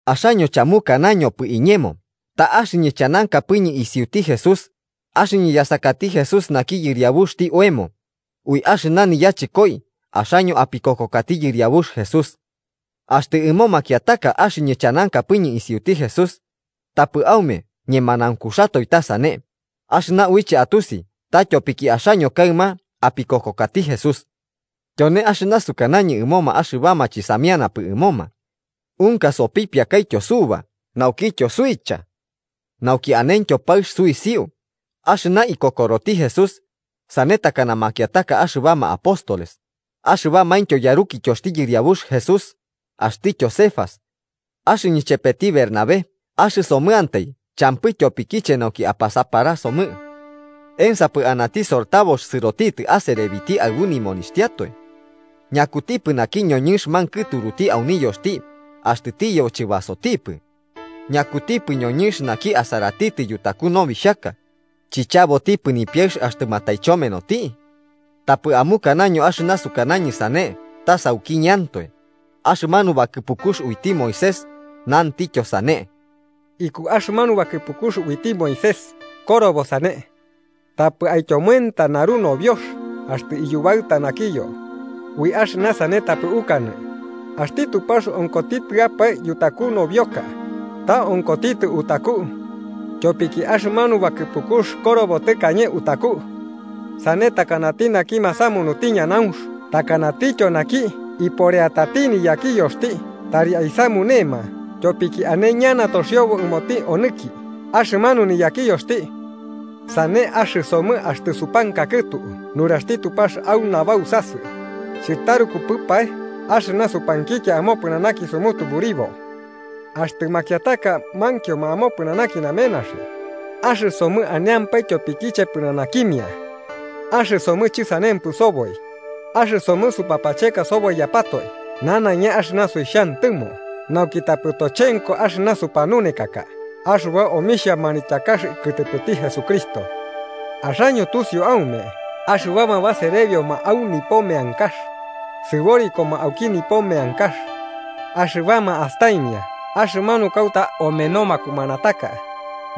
Axaño chamukanañopɨ iñemo ta axɨñɨ chanankapɨñɨ isiuti Jesús, axɨñɨ yasakati Jesús naki yɨriabuxti oemo, ui axɨna niyachɨkoi axaño apikokokati Yɨriabux Jesús. Axtɨ ɨmo makiataka axɨñɨ chanankapɨñɨ isiuti Jesús. Tapɨ aume ñemanaunkuxatoe ta sane, axɨna uiche atusi ta tyopiki axaño kaɨma apikokokati Jesús. Tyone axɨna sukanañɨ ɨmoma axɨbama chɨsamianapɨ ɨmoma: Unka sopipiakaityo suba naukityo suicha. Nauki anentyo paɨx suisiu axɨna ikokoroti Jesús, sane takana makiataka axɨbama apóstoles, axɨbamaintyo yarukityoxti Yɨriabux Jesús, axtityo Cefas. ¿Axɨñɨ chepeti Bernabé axɨsomɨantai champɨ tyopikiche nauki apasaparasomɨ? ¿Ensapɨ anati sortabox sɨrotitɨ aserebiti aɨbu nimonixhtiatoe? ¿Ñakutipɨ naki ñoñɨnx mankɨturuti au niyoxti axtɨ tiyebo chɨbasotipɨ? ¿Ñakutipɨ ñoñɨnx naki asaratitɨ yutaku nobixhaka, chichabotipɨ nipiaɨx axtɨ mataichomenoti? Tapɨ amukanaño axɨna sukanañɨ sane ta saukiñɨantoe, axɨmanu bakɨpukux uiti Moisés nantityo sane. Iku axɨmanu bakɨpukux uiti Moisés korobo sane: “Tapɨ aityomoenta naru nobiox axtɨ iyubaɨta nakiyo.” Ui axɨna sane tapɨ ukanɨ axti Tupax onkotitɨapae yutaku nobioka, ta onkotitɨ utaku. Tyopiki axɨmanu bakɨpukux korobo tɨkañe utaku. Sane takanati naki masamunuti ñanaunx takanatityo naki iporeatati niyakiyoxti tari aisamunema tyopiki ane ñana toxiobo ɨmoti onɨki axɨmanu niyakiyoxti. Sane axɨsomɨ axtɨ supankakɨtu nuraxti Tupax au nabausasɨ, ¿chɨtarukupɨpae axɨna supankikia amopɨnanaki sumutuburibo? Axtɨ makiataka mankioma amopɨnanaki namenaxi, axɨsomɨ aneampae tyopikiche pɨnanakimia. Axɨsomɨ chɨsanempɨ soboi, axɨsomɨ supapacheka soboiyapatoe nanaiña axɨna suixhantɨmo nauki tapɨ tochenko axɨna supanunekaka axɨba omixhia manityakax kɨtɨpɨti Jesucristo. Axaño tusiu aume axɨbama baserebioma au nipo meankax, sɨborikoma auki nipo meankax. Axɨbama astaimia axɨmanu kauta omeno makumanataka,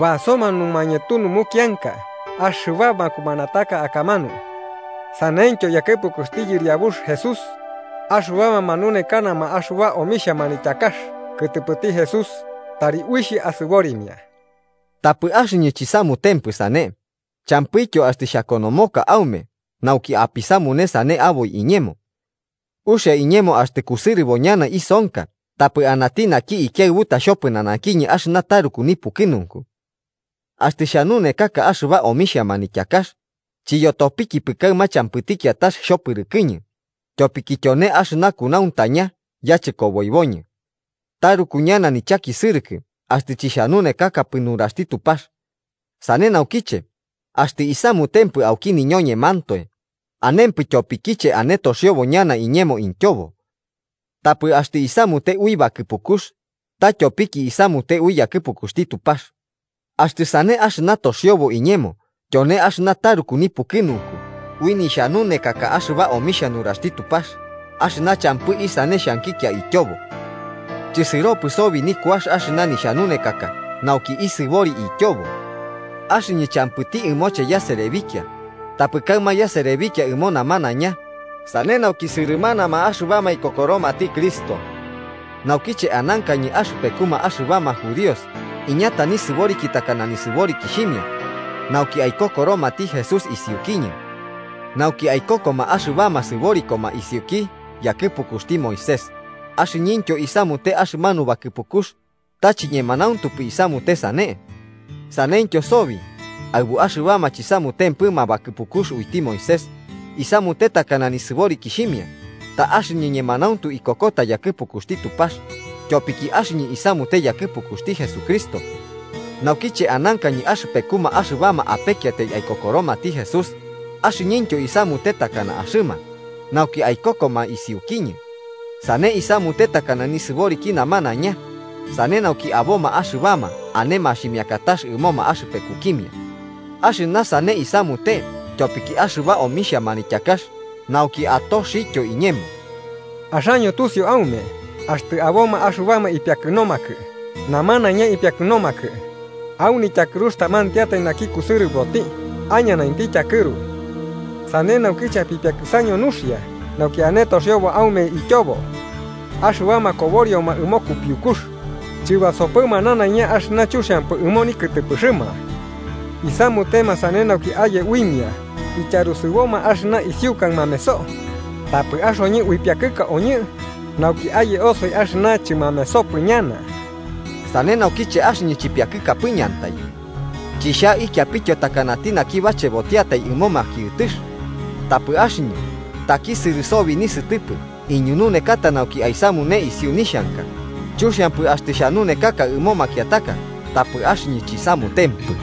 basoma numañetu numukianka axɨba makumanataka akamanu. Saneityo yakɨpukuxti Yɨriabux Jesús, axɨbama manunekanama axɨba omixhia manityakax kɨtɨpɨti Jesús tari uixh asɨborimia. Tapɨ axɨñɨ chisamutempɨ sane, champɨityo axtɨ xhakonomoka aume nauki apisamune sane aboi iñemo. ¡Uxia iñemo axtɨ kusɨrɨbo ñana isonka tapɨ anati naki ikiaɨbutati xhopɨnanakiñɨ axɨna taruku nipukɨnunku! Axtɨ xhanunekaka axɨba omixhia manityakax, chityopikipɨ kaɨma champɨti kiatax xhopɨrɨkɨñɨ, tyopiki tyone axɨna kunauntaña yachɨkoboiboñɨ. ¡Taruku ñana nichakisɨrɨkɨ axtɨ chixhanunekakapɨ nuraxti Tupax! Sane naukiche, axtɨ isamutempɨ auki niñoñemantoe, anempɨ tyopikiche ane toxiobo ñana iñemo ityobo. Tapɨ axtɨ isamute ui bakɨpukux, ta tyopiki isamute ui yakɨpukuxti Tupax. Axtɨ sane axɨna toxiobo iñemo tyone axɨna taruku nipukɨnunku ui nixhanunekaka axɨba omixhia nuraxti Tupax axɨna champɨ isane xhankikia ityobo. Chɨsɨropɨ sobi nikuax axɨna nixhanunekaka nauki isɨbori ityobo. Axɨñɨ champɨti ɨmoche yaserebikia, tapɨ kaɨma yaserebikia ɨmo namanaiña, sane nauki sɨrɨmanama axɨbama ikokoromati Cristo. Naukiche anankañɨ axɨpekuma axɨbama judíos iñata nisɨboriki takana nisɨborikixhimia, nauki aikokoromati Jesús isiukiñɨ. Nauki aikokoma axɨbama sɨborikoma isiuki yakɨpukuxti Moisés, axɨñɨntyo isamute axɨmanu bakɨpukux, ta chiñemanauntupɨ isamute sane. Saneityo sobi, aɨbu axɨbama chisamutempɨma bakɨpukux uiti Moisés, isamute takana nisɨborikixhimia, ta axɨñɨ ñemanauntu ikokota yakɨpukuxti Tupax, tyopiki axɨñɨ isamute yakɨpukuxti Jesucristo. Naukiche anankañɨ axɨpekuma axɨbama apekiatai aikokoromati Jesús, axɨñɨntyo isamute takana axɨma, nauki aikokoma isiukiñɨ. Sane isamute takana nisɨboriki namanaiña, sane nauki aboma axɨbama ane maximiakatax ɨmoma axɨpekukimia. Axɨna sane isamute tyopiki axɨba omixhia manityakax nauki, atoxityo iñemo. Axaño tusiu aume axtɨ aboma axɨbama ipiakɨnomakɨ namanaiña ipiakɨnomakɨ, au nityakɨrux tamantiatai naki kusɨrɨboti aiñanainti tyakɨru. Sane naukiche apipiakɨsaño nuxia nauki ane toxiobo aume ityobo. Axɨbama koborioma ɨmo kupiukux, chɨbasopɨma nanaiña axɨna chuxiampɨ ɨmo nikɨtɨpɨxɨma. Isamutema sane nauki aye uimia ityarusɨboma axɨna isiukai mameso, tapɨ axoñɨ uipiakɨkaoñɨ nauki aye osoi axɨna chɨmamesopɨ ñana. Sane naukiche axɨñɨ chipiakɨkapɨñɨantai. Chixhaikiapityo takanati naki bachebotiatai ɨmo makiɨtɨx. Tapɨ axɨñɨ takisɨrɨ sobi nisɨtɨpɨ iñununekata nauki aisamune isiu nixhanka, chuxiampɨ axtɨ xhanuneka ɨmo makiataka tapɨ axɨñɨ chisamutempɨ.